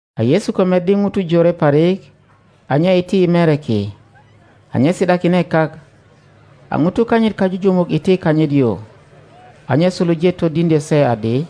A Yesu ko meddi ŋutu jore parik, a nye iti i mere ki. A nye si ’dakine kak, a ŋutu kanyit kajujumuk iti kanyit yu. A nye suluje todiŋdyö se adi,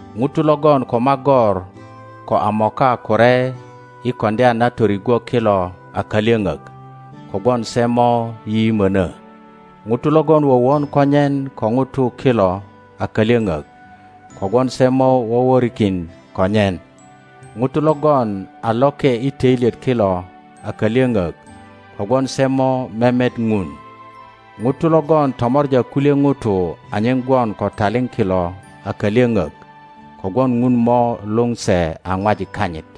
ŋutu logon ko magor ko a mokakure i koŋdya na torigwo kilo akalyöŋök; kogwon se mo yiyimöno. ŋutu logon wowon konyen ko ŋutu kilo a kalyöŋök; kogwon se mo woworikin konyen. ŋutu logon a loke i töilyet kilo a kalyöŋök; kögwon se mo memet Ŋun. ŋutu logon tomor a kulye ŋutu anyen gwon ko taliŋ kilo a kalyöŋök; kogwon Ŋun mo luŋ se a ŋwajik kanyit.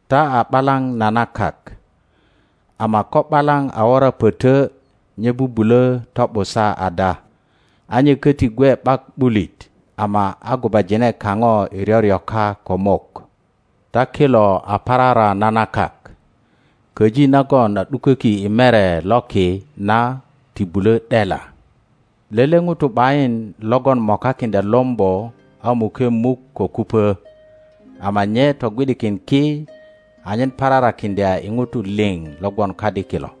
Ta a ’balaŋ na na kak. Ama ko ’balaŋ a wora pötö nye bubulö to ’busa ada? A nye köti gwe ’bak ’bulit ama a gubajine kaŋo i ryoryoka ko mok. Ta kilo a parara na na kak. Köji nagon a ’duköki i mere loki na ti bulö ’dela. Lele ŋuto ’bayin logon mokakiŋdya lombo a muke muk ko kupö, ama nye togwi ’dikin ki, anyen pararakiŋdya i ŋutu liŋ lo gwon kadi kilo.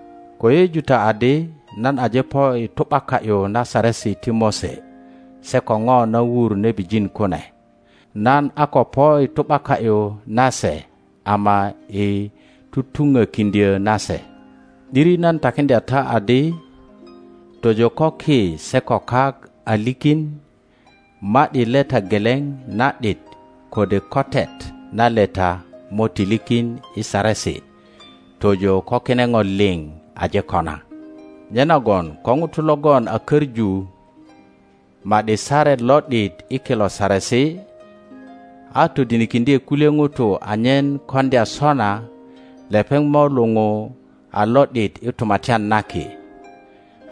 Ko yeyeju ta adi nan aje po i tu ’baka ’yu na Saresi ti Mose se ko ŋo na wur nebijin kune; nan a ko po i tu ’baka ’yu na se ama i tutuŋokiŋdyö na se. ’Diri nan takiŋdya ta adi, tojo ko ki se ko kak a likin, ma ’di leta geleŋ na ’dit kode kotet na leta mo ti likin i Saresi tojo ko kine ŋo liŋ aje kona. Nyenagon ko ŋuto logon a köŋu ma ’di saret lo ’dit i kilo saresi, todinikiŋdye kulye ŋutu anyen koŋdya sona, lepeŋ mo luŋu a lo ’dit i Tumatyan na Ki;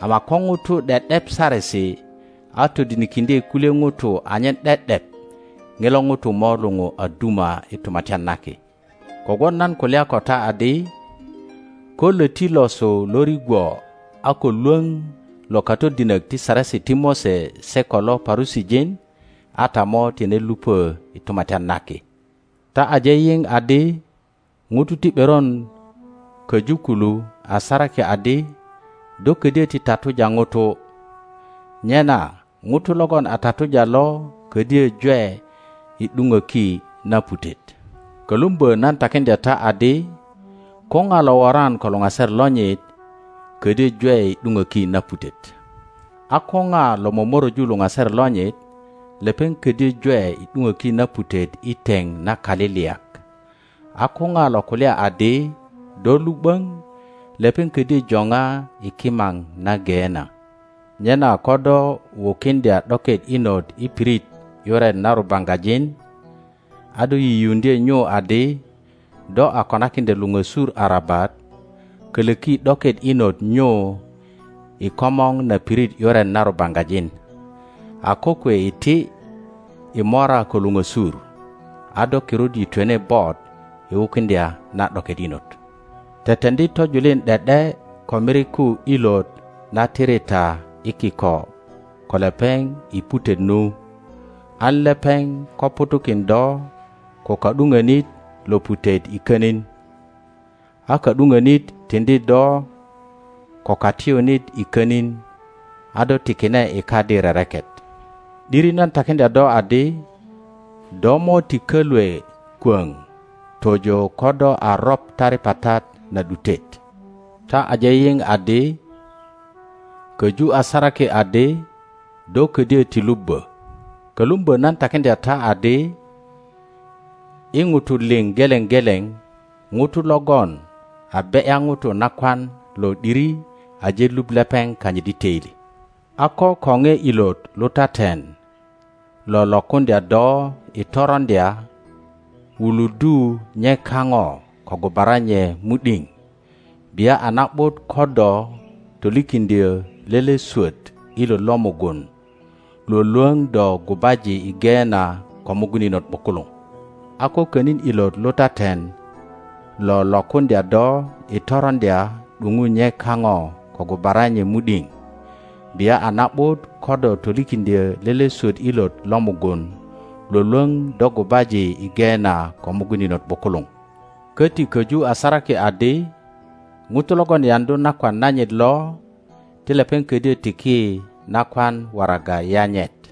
ama ko ŋuto ’de ’dep Saresi, a todinikiŋdye kulye ŋutu anyen ’de ’dep, ŋilo ŋuto mo luŋu a duma i Tumatyan na Ki. Kogwon nan kulya ko ta adi, ko löti losu lo rigwo a ko lwöŋ lo katodinok ti Saresi ti Mose se ko lo Parusijin, a ta mo tine lupö i Tumatyan na Ki. Ta aje yiŋ adi ŋutu ti ’beron köju kulu a saraki adi, Do ködyö ti tatuja ŋuto; nyena ŋuto logon a tatuja lo ködyö jwe i ’duŋöki na putet. kölumbö nan takiŋdya ta adi, ko ŋa lo woran ko luŋaser lonyit ködyö jwe i ’duŋöki na putet; a kö ŋa lo momoröju luŋaser lonyit, lepeŋ ködyö jwe i ’duŋöki na putet i teŋ na kaliliyak; a ko ŋa lo kulya adi, Do lu ’böŋ! lepeŋ ködyö joŋa i kimaŋ na Geena. Nyena kö dö wukiŋdya ’doket inot i pirit ’yuret na rubaŋgajin, a do yiyiuŋdye nyu adi do a konakiŋdya luŋösur arabat, kölöki ’doket inot nyu i komor na pirit ’yuret na rubaŋgajin. A kokwe iti i mora ko luŋösur, a do kirut yitwene bot i wukiŋdya na ’doket inot. Jeteŋdi tojulin ’de ’de ko miriku ilot na tiri ta i kiko ko lepeŋ i putet nu, an lepeŋ ko ŋutu kin do ko ka ’duŋönit lo putet i könin, a ka ’duŋönit tiŋdi do ko katiyunit i könin, a do tikine i kadi rereket. ’Diri nan takiŋdya do adi, do mo ti kölwe kwöŋ tojo ko do a roŋ taripatat na ’dutet. Ta aje yiŋ adi köju a saraki adi, Do ködyö ti lubbö. Kölumbö nan takiŋdya ta adi, I ŋutu liŋ geleŋ geleŋ, ŋuto logon a be ’ya ŋuto nakwan lo ’diri aje luŋ lepeŋ kanyit i töili. A ko koŋe ilot lutaten lo lokuŋdya do i toroŋdya, wuluddu nye kaŋo ko gubara nye mu ’diŋ; bia a na ’but ko do tolikiŋdyö lele swöt ilot lo mugun lwölwöŋ do gubaji i Geena ko mugun inot ’bukuluŋ. A ko könin ilot lutaten lo lokuŋdya do i toroŋdya, ’duŋu nye kaŋo ko gubara nye mu ’diŋ; bia a na ’but ko do tolikiŋdyö lele swöt ilot lo mugun Iwolwöŋ do gubaji i Geena ko mugun inot ’bukuluŋ. Köti köju a saraki adi, Ŋuto logon yaŋdu nakwan nanyit lo, ti lepeŋ ködyö tiki nakwan waraga yanyet.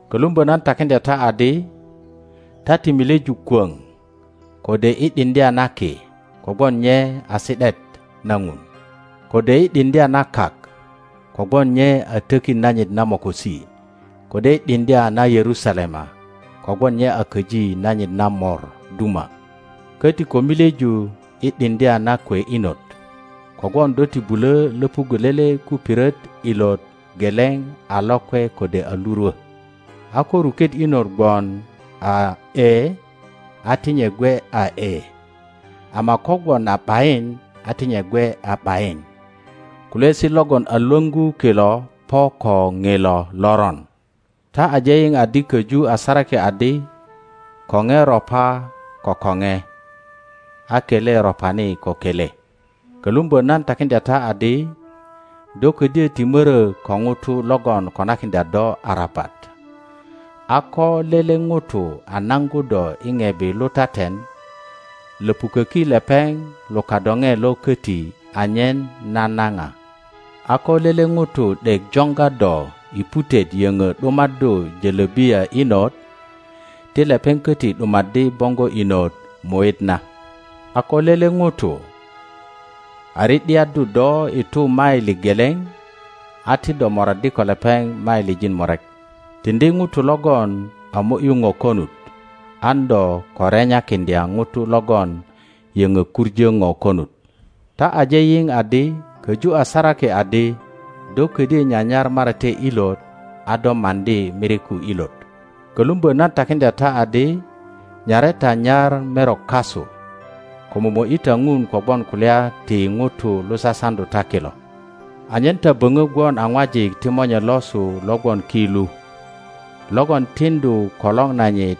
Kölumbö nan takiŋdya ta adi, ta ti milyeju kwöŋ, kode i ’diŋdya na ki, kogwon nye a si ’daet na Ŋun, kode i ’diŋdya na kak, kogwon nye a tökit nanyit na mokosi, kode i ’diŋdya na Yerusalema, kogwon nye a köji nanyit na Mor duma; köti ko milyeju i ’diŋdya na kwe inot, kogwon do ti bulö löpuggö lele kupiret ilot geleŋ a lokwe kode a lurwö. a ko ruket inot gwon a Ee, a ti nye gwe a Ee, ama ko gwon a ’Bayin, a ti nye gwe a ’Bayin. Kulyaesi logon a lwöŋgu kilo po ko ŋilo Loron. Ta aje yiŋ adi koju a saraki adi, Koŋe ropa ko koŋe, a kele ropani ko kele. Kölumbö nan takiŋdya ta adi, Do ködyö ti mörö ko ŋuto logon konakiŋdya do arabat. A ko lele ŋuto a naŋgu do i ŋebi lutaten, löpuköki lepeŋ lo kadoŋe lo köti anyen nanaŋa. a kö lele ŋuto ’dek joŋga do i putet yöŋö ’dumaddu jölobiya inot, ti lepeŋ köti ’dumaddi boŋgo inot muit na. A ko lele ŋuto a ri ’diaddu do i tu maili geleŋ, a ti do moraddi ko lepeŋ mailijin murek. Tiŋdi ŋuto logon a mo ’yu ŋo konut, an do ko renyakiŋdya ŋuto logon yöŋo kuŋö ŋo konut. Ta aje yiŋ adi köju a saraki adi, Do ködyö nyanyar marate ilot a do maŋdi miriku ilot. Kölumbö nan takiŋdya ta adi, Nyare ta nyar merok kasu, ko momo ’yi ta Ŋun kogwon kulya ti ŋutu lo sasaŋdu ta kilo, anyen ta böŋo gwon a ŋwajik ti Monye losu lo gwon ki lu, logon tiŋdu kolor nanyit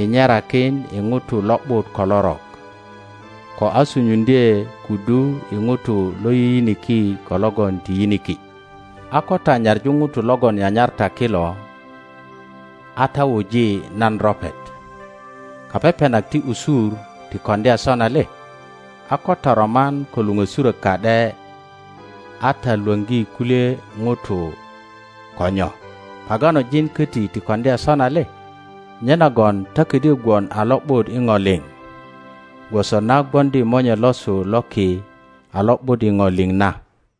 i nyerakin i ŋutu lo ’but ko lorok, ko a sunyuŋdye kudu i ŋutu lo yiyiniki ko logon ti yiniki. a ko ta nyaŋu ŋutu logon nyanyar ta kilo, a ta wuji nan ropet? Kapepenak ti usur ti koŋdya sona le? a ko ta roman ko luŋösurök ka ’de, a ta Iwoŋgi kulye ŋutu ko nyo? Paganojin köti ti koŋdya sona le? Nyenagon ta ködyö gwon a lo ’but i ŋo liŋ, gwoso na gwoŋdi Monye losu lo ki a lo ’but i ŋo liŋ na.